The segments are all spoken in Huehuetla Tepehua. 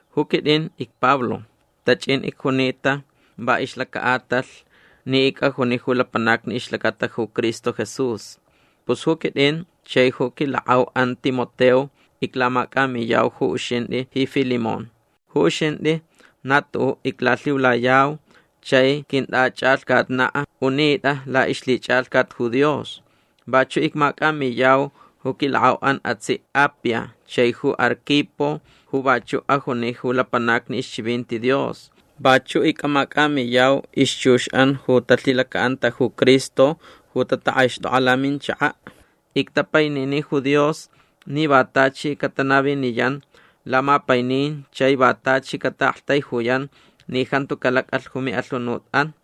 Ju quit'in icPablo. Tach'in icjunita va ixlaca'atalh ni ic'ajuni ju lapanacni ixlacata ju Cristo Jesús. Pus ju quit'in chai ju quilak'au'an Timoteo iclamac'amiyau ju uxint'i ji Filemón. Ju uxint'i na tu'u' iclalhiulayau chai quint'ach'alhcatna' unit'a la'ixlhich'alhcat ju Dios. Vachu' icmac'amiyau ju quilak'au'an atsi' Apia chai ju Arquipo ju vachu' ajuni ju lapanacni ixchivinti Dios. Vachu' ic'amac'amiyau ixchux'an ju talhilaca'anta ju Cristo ju tatak'aixt'ok'a laminchaka'. Ictapainini ju Dios ni va tachi catanaviniyan lamapainin chai va tachi cata'aktaijuyan ni jantu calac'alh ju mi'alhunut'an.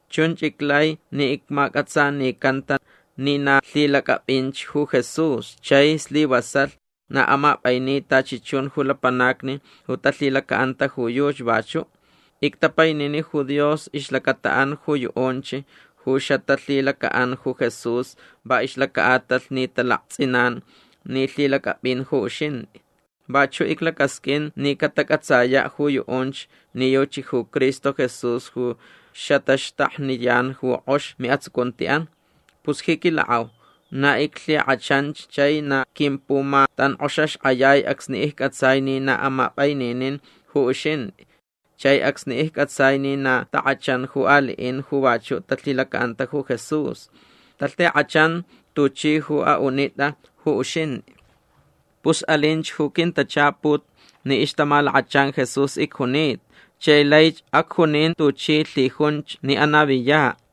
Chunch iclai ni icmac'atsanicanta ni na lhilac'ap'inch ju Jesús chai slivasalh na amap'aini tachi chun ju lapanacni ju talhilaca'anta ju yuchi vachu'. Ictapainini ju Dios ixlacata'an ju yu'unch ju xatalhilaca'an ju Jesús va ixlaca'atalh ni talakts'inan ni lhilac'ap'in ju uxint'i. Vachu' iclacasq'uin ni catac'atsaya' ju yu'unch ni yuchi ju Cristo Jesús ju xataxtakniyan ju k'ox mi'atsucunti'an. Pus ji quilak'au na iclhik'achanch chai na quimpumatank'oxaxk'ayai acsni icc'atsai ni na amap'aininin ju uxint'i chai acsni icc'atsai ni na tak'achan ju ali'in ju vachu' talhilaca'anta ju Jesús. Talhik'achan tuchi ju a'unit'a ju uxint'i. Pus alinch ju quintachaput ni ixtamalakachan Jesús icjunita chai laich acjunin tuchi lhijunch ni anaviya'.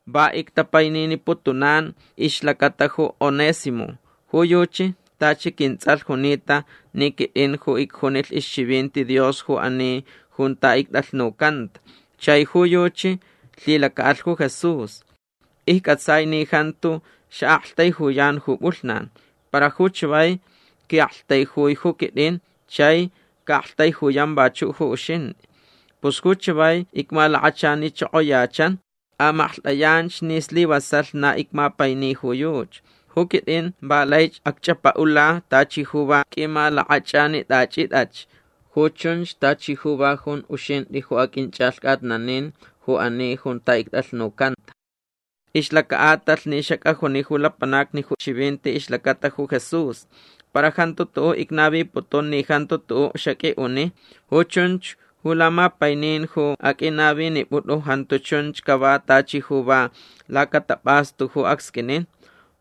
Va ictapaininiputunan ixlacata ju Onésimo. Ju yuchi tachi quints'alh junita ni quit'in ju icjunilh ixchivinti Dios ju ani junta ict'alhnucanta chai ju yuchi lhilaca'alh ju Jesús. Icc'atsai ni jantu xa'aktaijuyan ju p'ulhnan. Para ju chavai qui'aktaijui ju quit'in chai ca'aktaijuyan vachu' ju uxint'i. Pus ju chavai icmalakachanichokoyachan. Amaklht'ayanch ni slivasalh na icmapaini ju yuchi. Ju quit'in va laich acch'apa'ula tachi ju va q'uimalak'ach'anit'achit'ach. Ju chunch tachi ju va junch uxint'i ju aq'uinch'alhc'atnanilh ju ani junta ict'alhnucanta va ixlaca'atalh ni xac'ajuni ju lapanacni ju chivinti ixlacata ju Jesús. Para jantu tu'u' icnaviputun ni jantu tu'u' xaq'ui'uni. Ju chunch ju lamapainin ju aq'uinavinip'ut'u jantu chunch cava tachi ju va lacatap'astu ju acsq'uinin.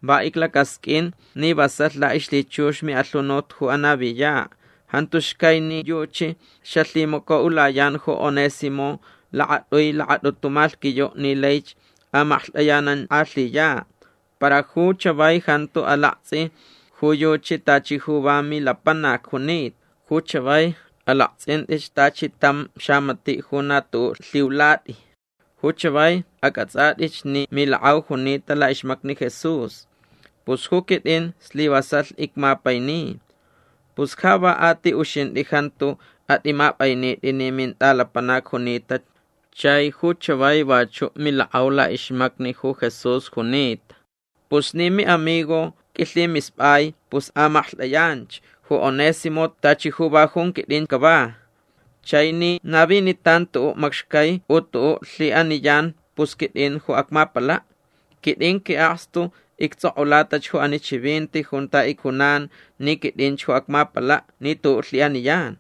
Va iclacasq'uin ni vasalh la'ixlhichux mi'alhunut ju anaviya'. Jantu xcai ni yuchi xalhimaco'ulayan ju Onésimo lakat'ui lakat'utu malhquiyu' ni laich amaklht'ayanank'alhiya'. Para ju chavai jantu alakts'i ju yuchi tachi ju va milapanac junita. Ju chavai alakts'int'ich tachi tam xamati' ju na tu'u' lhiulat'i. Ju chavai ac'ats'at'ich ni milak'au junita la'ixmacni Jesús. Pus ju quit'in slivasalh icmapaini. Pus ja va a ti uxint'i jantu at'imap'ainit'i ni mint'alapanac junita chai ju chavai vachu' milak'au la'ixmacni ju Jesús junita. Pus ni mi'amigo q'uilhimisp'ai pus amaklht'ayanch ju Onésimo tachi ju va junch quit'in cava. Chai ni navinitan tu'u' macxcai u tu'u' lhi'aniyan pus quit'in ju acmapala'. Quit'in qui'akstu icts'ok'ulatach ju ani chivinti junta icjunan ni quit'inch ju acmapala' ni tu'u' lhi'aniyan.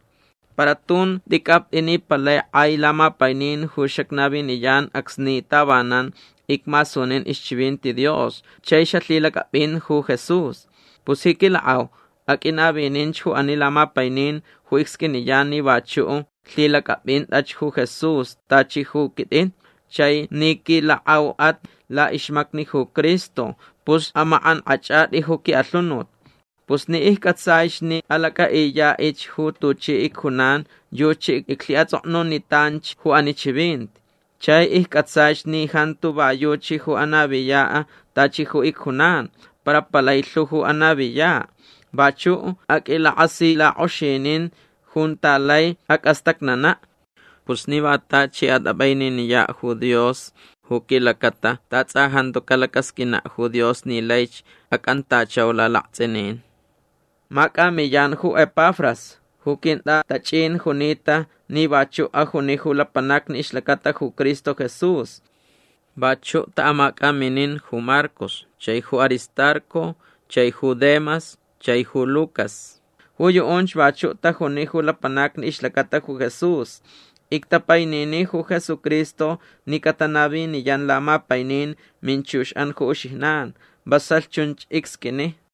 Para tun t'ic'apt'i ni palai k'ai lamapainin ju xacnaviniyan acsni tavanan icmasunin ixchivinti Dios chai xalhilac'ap'in ju Jesús. Pus ji quilak'au aq'uinavininch ju ani lamapainin ju icsq'uiniyan ni vachu' lhilac'ap'int'ach ju Jesús tachi ju quit'in. Chai ni quilak'au'at la'ixmacni ju Cristo pus amak'ank'ach'at'i ju qui'alhunut. Pus ni icc'atsaich ni alac'a'iya'ich ju tuchi icjunan yuchi iclhi'ats'oknunitanch ju ani chivinti. Chai icc'atsaich ni jantu va yuchi ju anaviya' tachi ju icjunan para palai lhu ju anaviya'. Vachu' aq'uilak'asilak'oxinin junta lai ac'astacnana'. Pus ni va tachi at'ap'aininiya' ju Dios ju quilacata ta ts'a jantu calacasq'uina' ju Dios ni laich ac'antachau lalakts'inin. Mac'amiyan ju Epafras ju quint'atach'in junita ni vachu' ajuni ju lapanacni ixlacata ju Cristo Jesús. Vachu' ta'amac'aminin ju Marcos chai ju Aristarco chai ju Demas chai ju Lucas. Ju yu'unch vachu' tajuni ju lapanacni ixlacata ju Jesús. Ictapainini ju Jesucristo ni catanaviniyan lamapainin minchux'an ju uxijnan. Vasalh chunch icsq'uini.